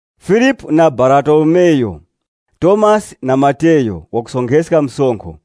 Filipu na Baratolomeyu. Tomasi na Mateyu wakusonkheska msonkho,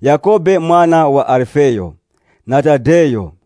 Yakhobe mwana wa Alifeyu, na Tadeyu.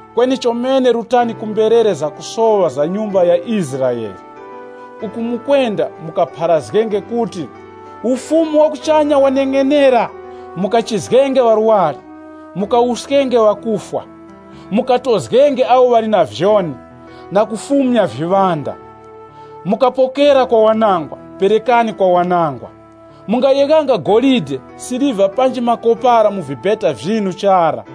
Kweni chomene rutani ku mberere zakusoŵa za mbumba ya Israele. Uku mukwenda mukapharazgenge kuti, ‘Ufumu wa kuchanya waneng'enera!’ Mukachizgenge ŵarwari, mukawuskenge ŵakufwa, mukatozgenge awo ŵali na vyoni, na kufumya viŵanda. Mukapokera kwa wanangwa, perekani kwa wanangwa. Mungayeghanga golide, siliva nesi makopara mu vibeta vyinu chara.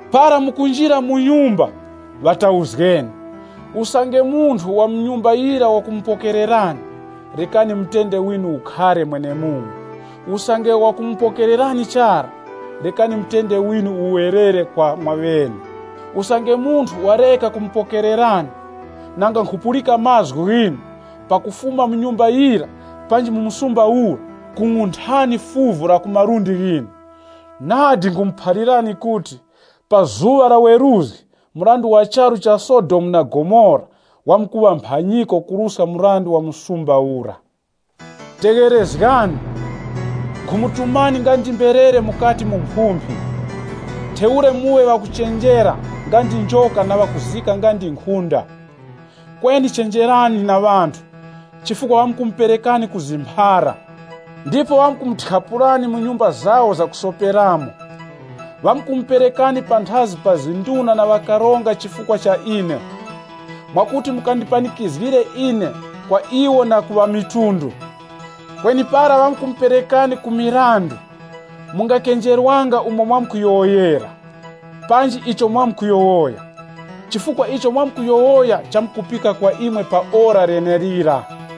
Para mukunjira mu nyumba, ŵatauzgeni. Usange munthu wa mu nyumba yira wakumupokererani, rekani mutende winu ukhare mwenemumo. Usange wakumupokererani chara, rekani mutende winu uwerere kwa mwaŵene. Usange munthu wareka kumupokererani, nanga nkhupulika mazgu ghinu, pakufuma mu nyumba yira panji mu muzi ura, kung'unthani fuvu la ku malundi ghinu. Nadi nkhumuphalirani kuti, pa zuŵa la weruzgi, mrandu wa charu cha Sodomu na Gomora wamkuŵa mphanyiko kuruska mrandu wa muzi ura.” “Tegherezgani! Nkhumutumani nga ndi mberere mukati mu mphumphi. Ntheura muŵe ŵakuchenjera nga ndi njoka na ŵakuzika nga ndi nkhunda. Kweni chenjerani na ŵanthu, chifukwa ŵamkumuperekani ku zimphara, ndipo ŵamkumuthyapulani mu nyumba zawo zakusoperamo. Ŵamkumuperekani panthazi pa nduna na ŵakaronga chifukwa cha ine, mwakuti mukandipanikizgire ine kwa iwo na ku ŵamitundu. Kweni para ŵamkumuperekani ku mirandu, mungakenjerwanga umo mwamkuyowoyera, panji icho mwamkuyowoya. Chifukwa icho mwamkuyowoya chamkupika kwa imwe pa ora lenelira.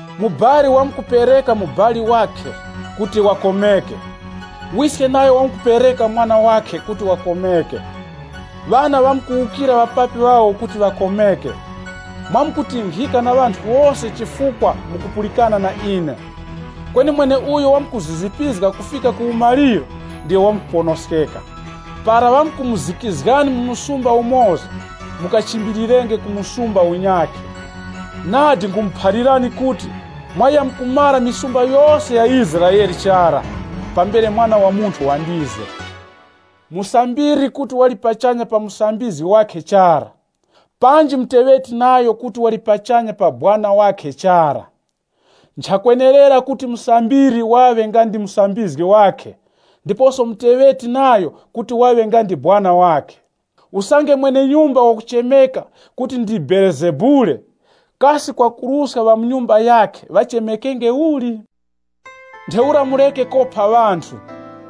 “Mubali wamkupereka mubali wakhe kuti wakomeke, wiske nayo wamkupereka mwana wakhe kuti wakomeke. Ŵana ŵamkuwukira ŵapapi ŵawo kuti ŵakomeke. Mwamkutinkhika na ŵanthu wose chifukwa mukupulikana na ine. Kweni mweneuyo wamkuzizipizga kufika ku umaliro, ndiyo wamkuponoskeka. Para ŵamkumuzikizgani mu muzi umoza, mukachimbilirenge ku msumba unyakhe. Nadi nkhumuphalirani kuti, mwayamkumara mizi yose ya Israele chara, pambere Mwana wa Munthu wandize. “Musambiri kuti wali pachanya pa musambizgi wakhe chara, panji muteŵeti nayo kuti wali pachanya pa sekuru wakhe chara. Nchakwenerera kuti musambiri waŵe nga ndi musambizgi wakhe, ndiposo muteŵeti nayo kuti waŵe nga ndi sekuru wakhe. Usange mwene-nyumba wakuchemeka kuti ndi Belezebule, kasi kwakuruska ŵa mu nyumba yakhe ŵachemekenge uli? “Ntheura mureke kopa ŵanthu.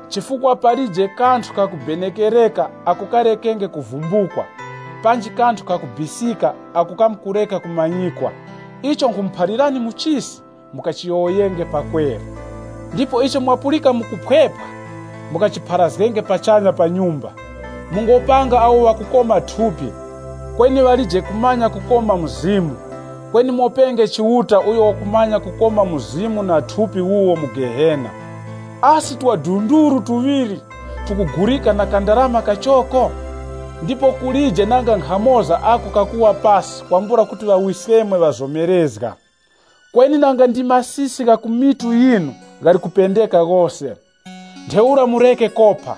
Chifukwa palije kanthu kakubenekerereka ako karekenge kuvumbukwa, panji kanthu kakubisika ako kamkureka kumanyikwa. Icho nkhumuphalirani mu chisi, mukachiyowoyenge pakweru. Ndipo icho mwapulika mu kuphwepwa, mukachipharazgenge pachanya pa nyumba. Mungopanga awo ŵakukoma thupi, kweni ŵalije kumanya kukoma mzimu. Kweni mopenge Chiuta uyo wakumanya kukoma mzimu na thupi wuwo mu Gehena Asi twadunduru tuŵiri tukugulika na kandarama kachoko? Ndipo kulije nanga nkhamoza ako kakuwa pasi kwambula kuti Ŵawiskemwe ŵazomerezga. Kweni nanga ndi masisi gha ku mitu yinu ghali kupendeka ghose. Ntheura mureke kopa,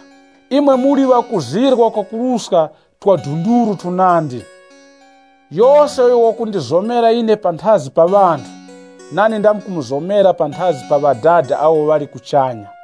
imwe muli ŵakuzirwa kwakuruska twadunduru tunandi. “Yose uyo wakundizomera ine panthazi pa ŵanthu, nane ndamkumuzomera panthazi pa Ŵadada awo ŵali kuchanya.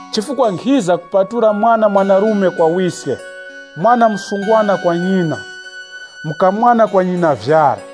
Chifukwa nkhiza kuti mwana mwanarume wawukire ŵawiske, mwana mwanakazi wawukire ŵanyina, mukamwana wawukire ŵanyinavyara.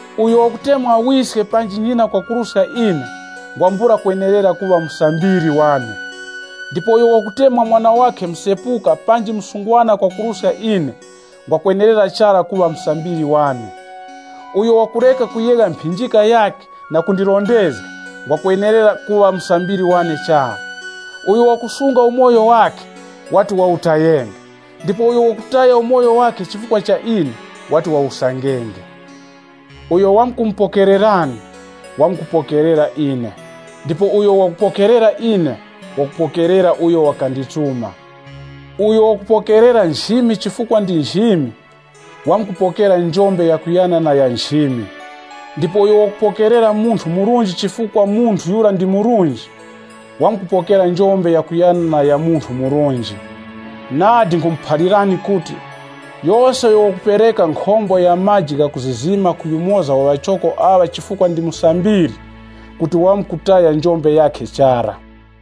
“Uyo wakutemwa wiske panji nyina kwakuruska ine, ngwambula kwenerera kuŵa musambiri wane. Ndipo uyo wakutemwa mwana wakhe msepuka panji msungwana kwakuruska ine, ngwakwenerera chara kuŵa musambiri wane. Uyo wakureka kuyegha mphinjika yakhe na kundirondezga, ngwakwenerera kuŵa musambiri wane chara. Uyo wakusunga umoyo wakhe, wati wawutayenge, ndipo uyo wakutaya umoyo wakhe chifukwa cha ine, wati wawusangenge. “Uyo wamkumupokererani, wamkupokerera ine. Ndipo uyo wakupokerera ine wakupokerera uyo wakandituma. Uyo wakupokerera nchimi chifukwa ndi nchimi, wamkupokera njombe yakuyana na ya nchimi. Ndipo uyo wakupokerera munthu murunji chifukwa munthu yura ndi murunji wamkupokera njombe yakuyana na ya munthu murunji. Nadi nkhumuphalirani kuti, yose uyo wakupereka nkhombo ya maji gha kuzizima ku yumoza wa ŵachoko aŵa chifukwa ndi musambiri, kuti wamkutaya njombe yakhe chara.”